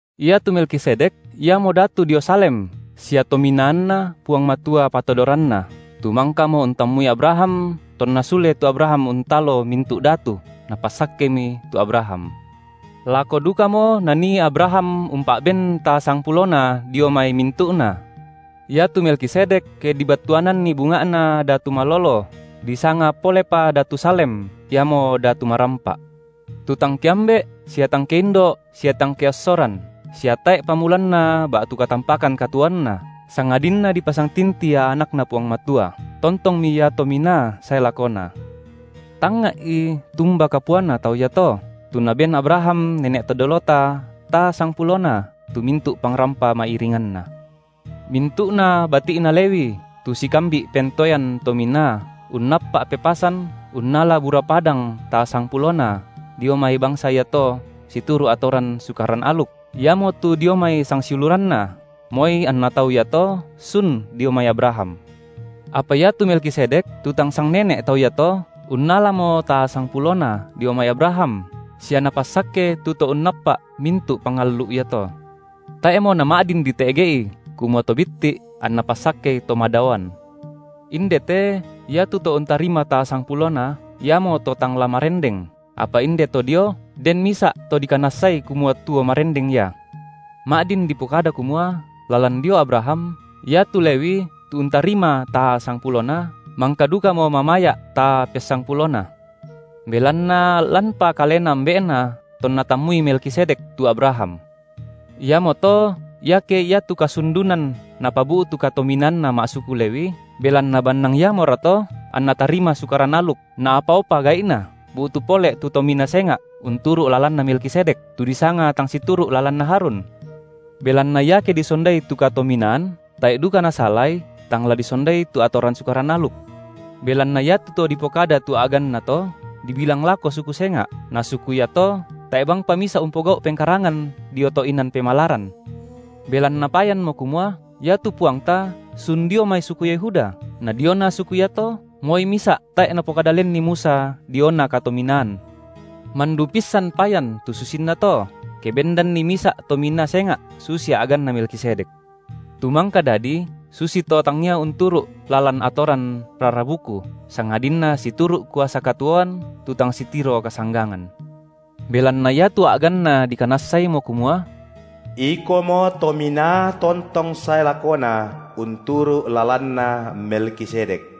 Iatu Melkisedek iamo datu dio Salem sia tominaanNa Puang Matua patodoranna, tu mangkamo untammui Abraham tonna sule tu Abraham untalo mintu’ datu, napassakkemi tu Abraham. Lako dukamo nanii Abraham umpa’ben taa sangpulona dio mai mintu’na. Iatu Melkisedek, ke dibattuananni bunga’na, datu malolo, disanga polepa datu Salem, iamo datu marampa’. Tu tang keambe’ sia tang keindo’ sia tang keossoran, sia tae’ pamulanna ba’tu katampakan katuoanna, sangadinna dipasangtinti ia AnakNa Puang Matua, tontongmi ia Tominaa sae lakona. Tangnga’i tumba kapuana tau iato, tu naben Abraham nene’ to dolota taa sangpulona tu mintu’ pangrampa ma’iringanna. Mintu’na bati’na Lewi tu sikambi’ pentoean tominaa unnappa’ pepasan unnala bura padang taa sangpulona dio mai bangsa iato situru’ atoran Sukaran aluk, iamotu dio mai sangsiuluranna, moi anna tau iato sun dio mai Abraham; apa iatu Melkisedek tu tang sangnene’ tau iato, unnalamo taa sangpulona dio mai Abraham sia napassakke tu to unnappa’ mintu’ pangallu’ iato. Tae’mo nama’din dite’ge’i kumua to bitti’ anna passakkei to madaoan. Inde te iatu to untarima taa sangpulona iamo to tang la marendeng, apa inde to dio den misa’ to dikanassai kumua tuo marendeng ia. Ma’din dipokada kumua lalan dio Abraham, iatu Lewi tu untarima taa sangpulona, mangka dukamo mamaya’ taa pessangpulona, belanna lanpa kalena ambe’na tonna tammui Melkisedek tu Abraham. Iamoto iake iatu kasundunan napabu’tu katominaanna ma’suku Lewi, – belanna bannang iamorato anna tarima Sukaran aluk naapaopa gai’na bu’tu pole tu tominaa senga’ unturu’ lalanna Melkisedek, tu disanga tang situru’ lalanna Harun? Belanna iake disondai tu katominaan, tae’ duka nasalai tang la disondai tu atoran Sukaran aluk. Belanna iatu To dipokada tu a’ganNa to, dibilang lako suku senga’, na suku iato tae’ bangpa misa’ umpogau’ pengkarangan dio to’ inan pemalaran. Belanna payanmo kumua iatu Puangta sun dio mai suku Yehuda, na diona suku iato moi misa’ tae’ napokada lenni Musa diona katominaan. Mandu pissan payan tu susinna to, ke bendanni misa’ tominaa senga’ susi a’ganna Melkisedek, tu mangka dadi susito tangia unturu’ lalan atoran rara buku, sangadinna situru’ kuasa katuoan tu tang sitiro kasanggangan. Belanna iatu a’ganNa dikanassaimo kumua: Ikomo Tominaa tontong sae lakona unturu’ lalanna Melkisedek.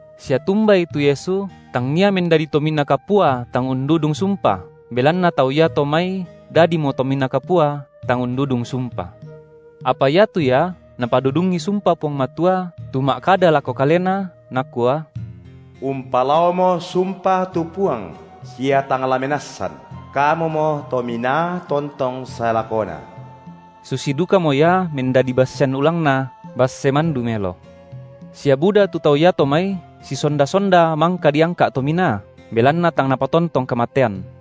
Sia tumbai tu Yesu tangia mendadi Tominaa Kapua tang undudung sumpa belanna tau iato mai dadimo Tominaa Kapua tang undudung sumpa, apa iatu Ia Napadudungi sumpa Puang Matua tu ma’kada lako Kalena, Nakua: Umpalaomo sumpa tu Puang sia tang la menassan, Kamumo Tominaa tontong sae lakona. Susi dukamo Ia mendadi bassean ulangna basse mandu melo. Sia buda tu tau iato mai sisonda-sonda mangka diangka’ tominaa, belanna tang napatontong kamatean;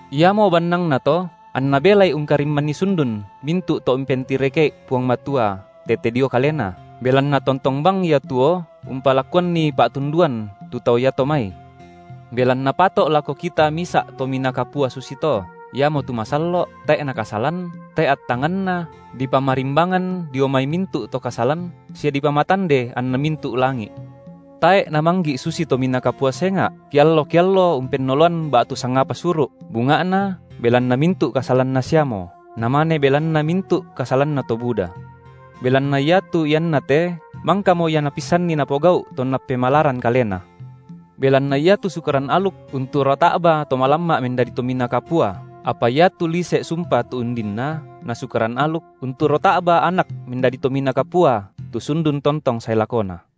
Iamo bannangna to anNa belai ungkarimmanni sundun mintu’ to umpentireke’i Puang Matua tete dio Kalena, belanna tontong bang Ia tuo umpalakuanni pa’tunduan tu tau iato mai. Belanna pato’ lako kita misa’ Tominaa Kapua susito, iamotu masallo’, tae’ Nakasalan, tae’ attanganNa, dipamarimbangan dio mai mintu’ to kasalan sia dipamatande anna mintu’ langi’, tae’ Namanggi’ susi tominaa kapua senga’, kiallo-kiallo umpennoloan ba’tu sangapa suru’, bunga’na belanna mintu’ kasalanna siamo, namane belanna mintu’ kasalanna to buda. Belanna iatu ianna te mangkamo Ia Napissanni Napogau’ tonna pemalaran Kalena. Belanna iatu Sukaran aluk unturo ta’ba to malamma’ mendadi Tominaa Kapua, apa iatu lise’ sumpa tu undinna, na Sukaran aluk, unturo ta’ba Anak mendadi Tominaa Kapua tu sundun tontong sae lakona.